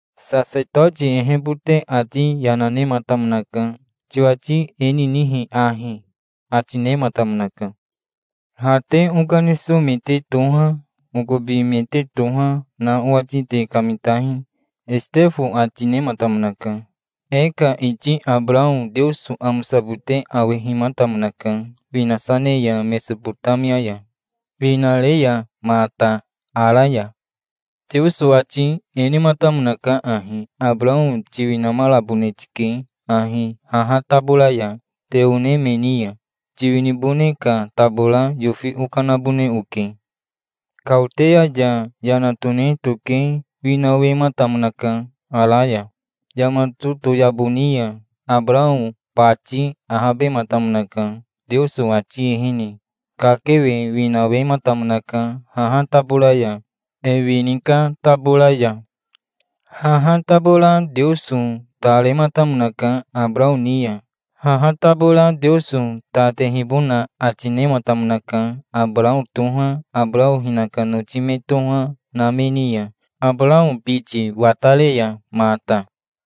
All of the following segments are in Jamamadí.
Sasetoti ehebote ati yana nematamonaka. "Tiwati e ninihi ahi?" ati nematamonaka. "Ha te okaniso me te toha, okobi me te toha, na owati te kamitahi", Esitefo ati nematamonaka. "E ka iti Abarao Teoso amosabote awehimatamonaka, winasa ne ya Mesobotamia ya, winare ya mata Ara ya". "Teoso ati e nematamonaka ahi: 'Abarao tiwinamarabone tike ahi haha tabora ya, te one me ni ya. Tiwinibone ka tabora yofi okanabone oke'. Kaoteya ya yana tone toke winawematamonaka Ara ya". "Yama totoyabo ni ya Abarao bati ahabematamonaka. Teoso ati ehene kakewe winawematamonaka haha tabora ya, e wini ka tabora ya. Haha tabora Teoso ta rematamonaka Abarao ni ya. Haha tabora Teoso ta tehibona ati nematamonaka, Abarao toha, Abarao hinaka noti me toha, na me ni ya, Abarao biti watare ya mata.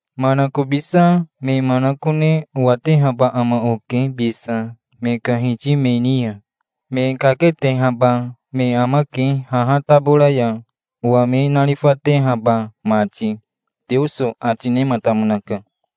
Manakobisa me manakone owatehaba ama oke bisa, me ka hiti me ni ya. Me kaketehaba me amake haha tabora ya, owa me narifatehaba mati', Teoso ati nematamonaka".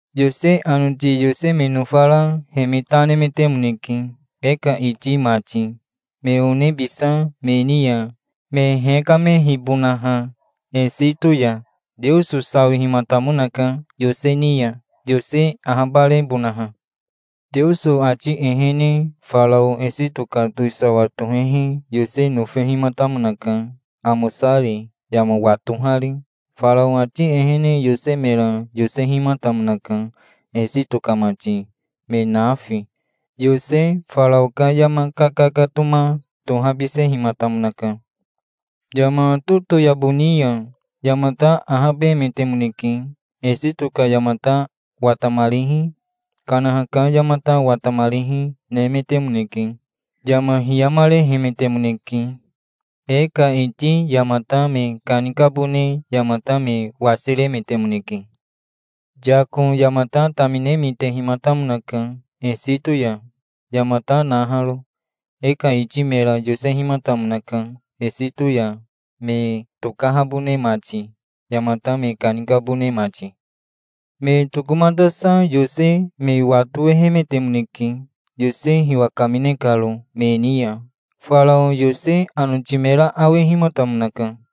"Yose anoti Yose me nofara he me ta nemetemoneke, e ka iti mati, me one bisa me ni ya, me hekamehibonaha Esito ya. Teoso sawihimatamonaka Yose ni ya, Yose ahabarebonaha. Teoso ati ehene Farao Esito ka towisawa tohehi Yose nofehimatamonaka, amosari, yama watohari. Farao ati ehene Yose mera yosehimatamonaka, Esito ka mati, me nafi. Yose Farao ka yama kakakatoma tohabisehimatamonaka. Yama totoyabo ni ya yamata ahabemetemoneke. Esito ka yamata watamarihi, Kanaha ka yamata watamarihi, nemetemoneke. Yama hiyamarehemetemoneke. E ka iti yamata me kanikabone yamata me wasiremetemoneke. Yako yamata tamine mitehimatamonaka, Esito ya yamata naharo. E ka iti mera yosehimatamonaka, Esito ya me tokahabone mati, yamata me kanikabone mati. Me tokomatasa Yose me watowehemetemoneke, Yose hiwa kamine karo me ni ya. Farao Yose anoti mera awehimatamonaka.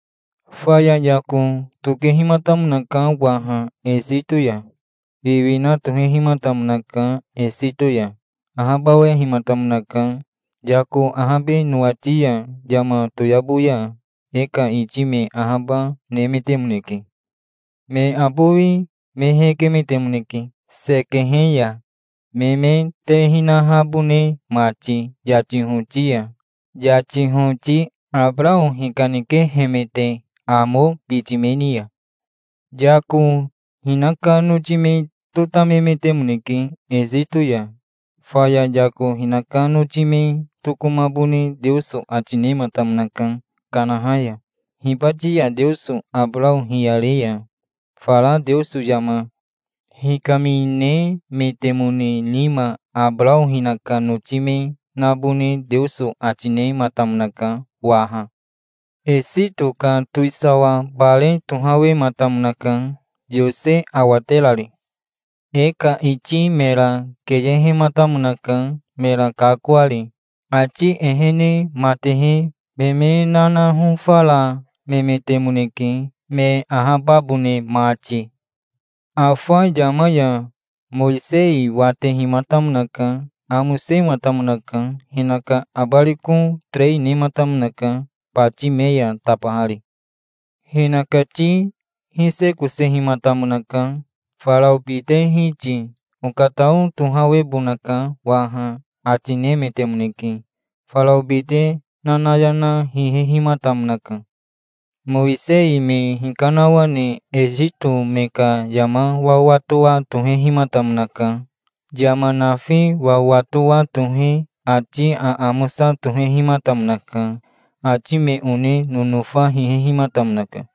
Faya Yako tokehimatamonaka waha Esito ya. Wiwina tohehimatamonaka Esito ya. Ahabawahematamonaka. Yako ahabe nowati ya yama toyabo ya e ka iti me ahaba nemetemoneke. Me abowi me hekemetemoneke Sekehe ya, me me te hinahabone mati yati hoti ya, yati hoti Abarao hikanikehemete Amo biti me ni ya". "Yako hinaka noti me totamemetemoneke Esito ya. Faya Yako hinaka noti me tokomabone Teoso ati nematamonaka Kanaha ya. Hibati ya Teoso Abarao hiyare ya fara Teoso yama hikaminemetemone nima Abarao hinaka noti me nabone Teoso ati nematamonaka waha. Esito ka towisawa bare tohawematamonaka, Yose awaterari. E ka iti mera keyehematamonaka, mera kakoari. Ati ehene matehe me me nanahofaramemetemoneke, me ahababone mati". "Afa yama ya Mowisei watehimatamonaka. Amosematamonaka. Hinaka abariko terei nematamonaka, bati me ya tabahari. Hinakati hisekosehimatamonaka. Farao bite hiti, "Okatao tohawebonaka waha", ati nemetemoneke. Farao bite nanayana hihehimatamonaka. Mowisei me hikanawane Esito me ka yama wawatowa tohehimatamonaka. Yama nafi wawatowa tohe ati aamosa tohehimatamonaka. Ati me one nonofa hihehimatamonaka".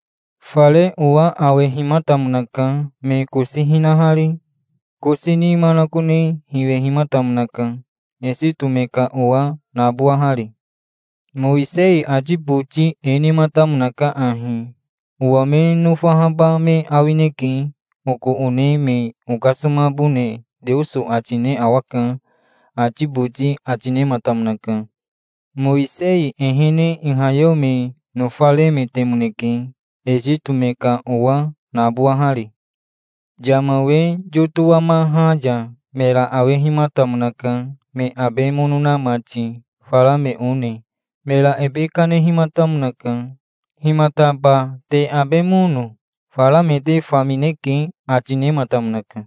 Fare owa awehimatamonaka, me kosi hinahari. Kosi ni manakone hiwehimatamonaka, Esito me ka owa nabowahari. Mowisei ati boti e nematamonaka ahi: 'Owa me nofahaba me awineke. Oko one me okasomabone Teoso ati ne awaka', ati boti ati nematamonaka". "Mowisei ehene ihayeo me nofaremetemoneke, Esito me ka owa nabowahari. Yama we yotowamaha ya mera awehimatamonaka, me abe mono na mati, fara me one. Mera ebe kanehimatamonaka. 'Himataba te abe mono? Fara me te famineke', ati nematamonaka.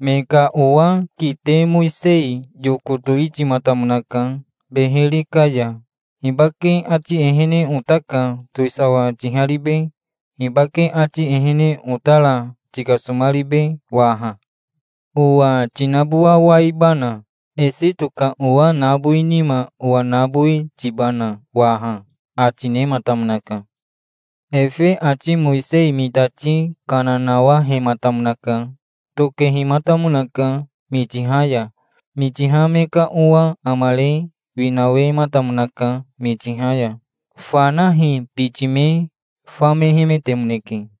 "Me ka owa kite Mowisei yoko towitimatamonaka beheri ka ya. 'Hibake ati ehene ota ka towisawa tiharibe? Hibake ati ehene otara tikasomaribe waha? Owa tinabowawaibana? Esito ka owa nabowi nima owa nabowi tibana waha?' ati nematamonaka". "Efe ati Mowisei mitati kana nawahematamonaka. Tokehimatamonaka Mitiha ya. Mitiha me ka owa amare winawematamonaka Mitiha ya. Fanahi biti me famehemetemoneke.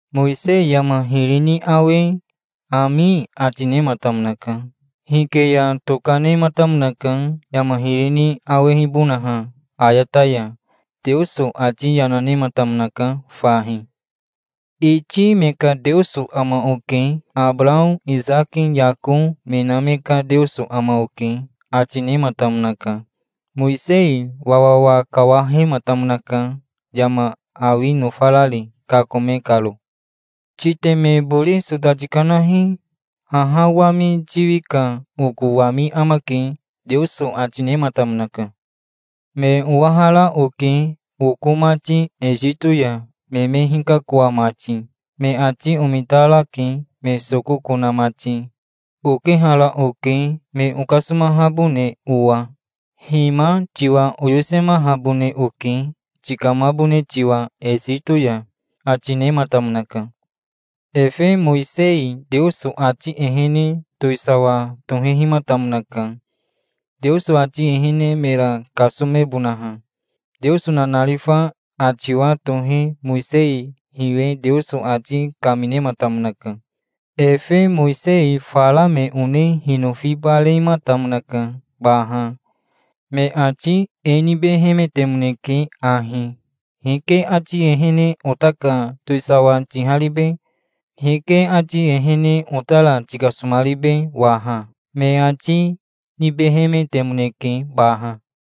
Mowisei yama hiri ni awe, 'Ami', ati nematamonaka. Hike ya toka nematamonaka, yama hiri ni awehibonaha ayata ya". "Teoso ati yana nematamonaka fahi. 'Iti me ka Teoso ama oke. Abarao, Isaki, Yako, me na me ka Teoso ama oke', ati nematamonaka". "Mowisei wawawa kawahematamonaka, yama awi nofarari, kakome karo". "'Titeme bori sota tikanahi. Haha wami tiwi ka oko wami amake', Teoso ati nematamonaka. 'Me owahara oke, oko mati Esito ya, me me hikakoa mati. Me ati omitarake, me sokoko na mati. Okehara oke, me okasomahabone owa. Hima, tiwa oyosemahabone oke, tikamabone tiwa Esito ya', ati nematamonaka". "Efe Mowisei Teoso ati ehene towisawa tohehimatamonaka, Teoso ati ehene, mera kasomebonaha. Teoso nanarifa atiwa tohe Mowisei hiwe Teoso ati kaminematamonaka". "Efe Mowisei fara me one hinofibarematamonaka baha. Me ati e nibehemetemoneke ahi, 'Hike ati ehene ota ka towisawa tiharibe? Hike ati ehene otara tikasomaribe waha?' me ati nibehemetemoneke baha".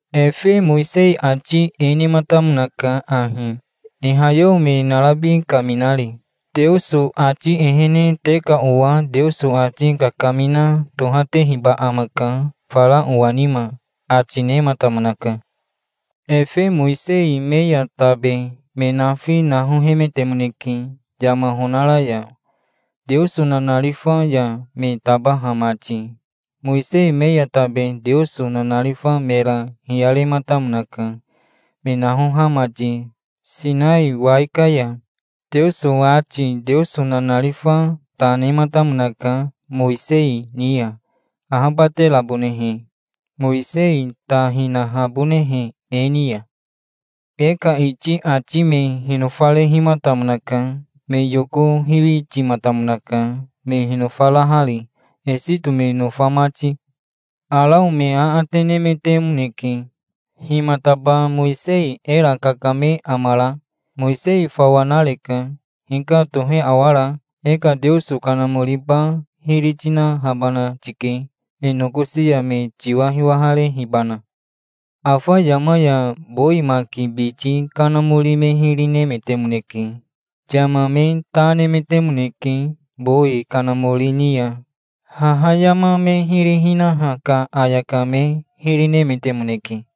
"Efe Mowisei ati e nematamonaka ahi, ihayeo me narabi kaminari: 'Teoso ati ehene te ka owa Teoso ati kakamina tohatehiba amaka fara owa nima', ati nematamonaka. Efe Mowisei me ya tabe me nafi nahohemetemoneke yama honara ya, Teoso nanarifa ya me tabaha mati. Mowisei me ya tabe Teoso nanarifa mera hiyarematamonaka, me nahoha mati Sinai wai ka ya. Teoso ati Teoso nanarifa ta nematamonaka Mowisei ni ya, ahabaterabonehe, Mowisei ta hinahabonehe e ni ya". "E ka iti ati me hinofarehimatamonaka. Me yoko hiwitimatamonaka, me hinofarahari, Esito me nofa mati. Arao me aate nemetemoneke. 'Himataba Mowisei era kakame amara? Mowisei fawa nareka. Hika tohe awara? E ka Teoso kanamoriba hiri tinahabana tike, e nokosi ya me tiwa hiwaharehibana'. Afa yama ya bowi maki biti kanamori me hiri nemetemoneke. Yama me ta nemetemoneke bowi kanamori ni ya. Haha yama me hiri hinaha ka ayaka me hiri nemetemoneke".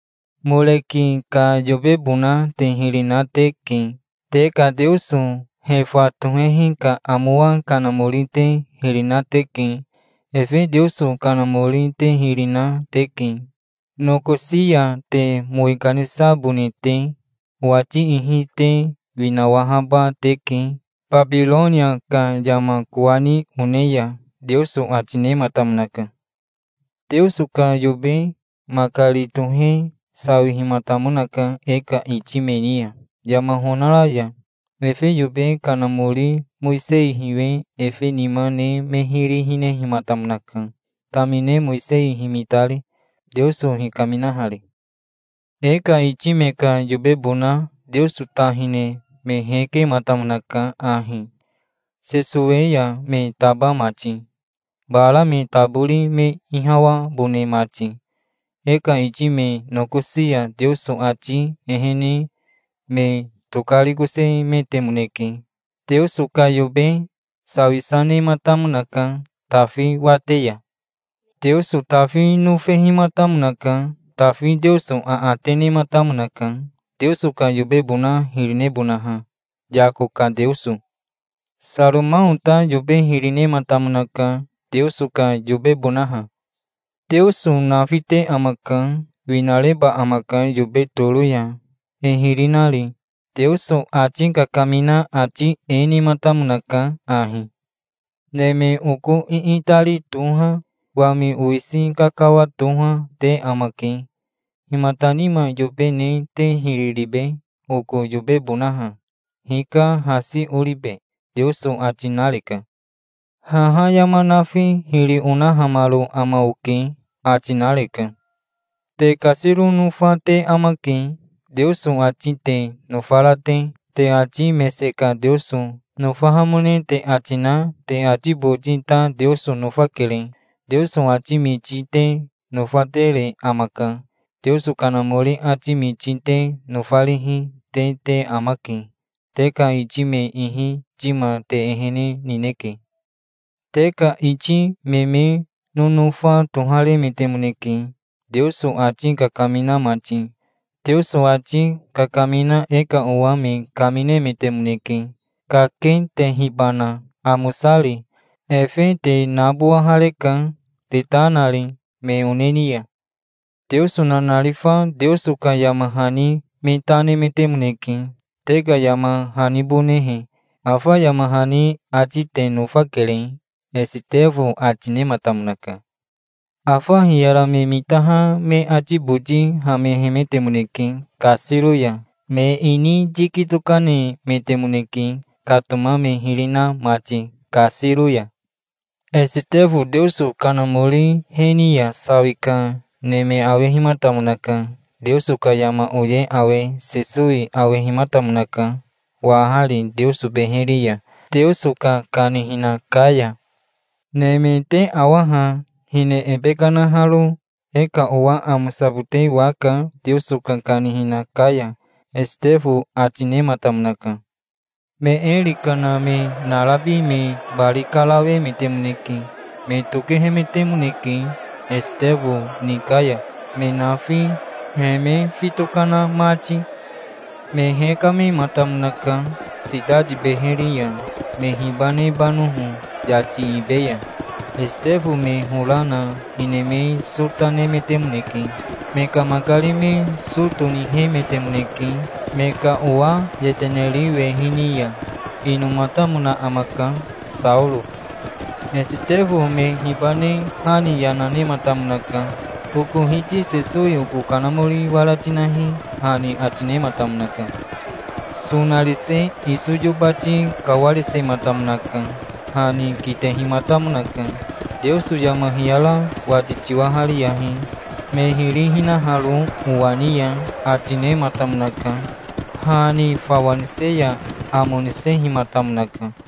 Moreki ka yobebona te hiri na teke. Te ka teoso Hefa tohehi ka amowa kanamori te hiri na teke. Efe teoso kanamori te hiri na teke, nokosi ya te mowi kanisabone te. Owati ihi te winawahaba teke Babironia ka yama kowani one ya', Teoso ati nematamonaka". "Teoso ka yobe makari tohe sawihimatamonaka e ka iti me ni ya, yama honara ya. Efe yobe kanamori Mowisei hiwe efe nima ne me hiri hinehimatamonaka, tamine Mowisei himitari, Teoso hikaminahari. E ka iti me ka yobebona Teoso ta hine me hekematamonaka ahi, Sesowe ya me taba mati, bara me tabori me ihawabone mati. E ka iti me nokosi ya Teoso ati ehene me tokarikosemetemoneke. Teoso ka yobe sawisa nematamonaka Tafi wate ya. Teoso Tafi nofehimatamonaka. Tafi Teoso aate nematamonaka, Teoso ka yobebona hiri nebonaha, Yako ka Teoso. Saromao ta yobe hiri nematamonaka, Teoso ka yobebonaha". "Teoso nafite amaka. Winareba amaka yobe toro ya, e hiri nari. Teoso ati kakamina ati e nematamonaka ahi: '"Neme oko iitari toha, wami owisi kakawa toha, te amake. Himata nima yobe ne te hiri ribe, oko yobebonaha? Hika hasi oribe?" Teoso ati nareka. "Haha yama nafi hiri onahamaro ama oke", ati nareka'". "Te kasiro nofa te amake, Teoso ati te nofara te. Te ati mese ka Teoso nofahamone te ati na te ati boti ta Teoso nofakere. Teoso ati miti te nofatere amaka. Teoso Kanamori ati miti te nofarihi, te te amake. Te ka iti me ihi tima te ehene nineke. Te ka iti me me nonofa toharemetemoneke, Teoso ati kakamina mati. Teoso ati kakamina e ka owa me kaminemetemoneke, kaketehibana, amosari. Efe te nabowahareka, te ta nari me one ni ya. Teoso nanarifa Teoso ka yama hani me ta nemetemoneke, te ka yama hanibonehe. Afa yama hani ati te nofakere", Esitefo ati nematamonaka. Afa hiyara me mitaha me ati boti hamehemetemoneke kasiro ya. Me ini yiki tokanemetemoneke, katoma me hiri na mati kasiro ya. Esitefo Teoso Kanamori he ni ya sawi ka neme awehimatamonaka. Teoso ka yama oye awe Sesowi awehimatamonaka, wahari Teoso beheri ya, Teoso ka kanihina ka ya. "Neme te awa ha, hine ebe kanaharo. E ka owa amosabote waka Teoso ka kanihina ka ya", Esitefo ati nematamonaka. Me eri kana me narabi me bari karawemetemoneke. Me tokehemetemoneke Esitefo ni ka ya, me nafi, he me fito kana mati. Me hekamehimatamonaka sitati beheri ya, me hibanebanoho yati ibe ya. Esitefo me hora na hine me sota nemetemoneke. Me ka makari me so tonihemetemoneke me ka owa yeteneri wehi ni ya. Inomatamona amaka Saoro. Esitefo me hibane ha ni yana nematamonaka. "Oko Hiti Sesowi oko kanamori wara tinahi", ha ni ati nematamonaka. Sonarise iso yobati kawarisematamonaka. Ha ni kitehimatamonaka. "Teoso yama hiyara wati tiwahariyahi, me hiri hinaharo owa ni ya", ati nematamonaka. Ha ni fawa nise ya amo nisehimatamonaka.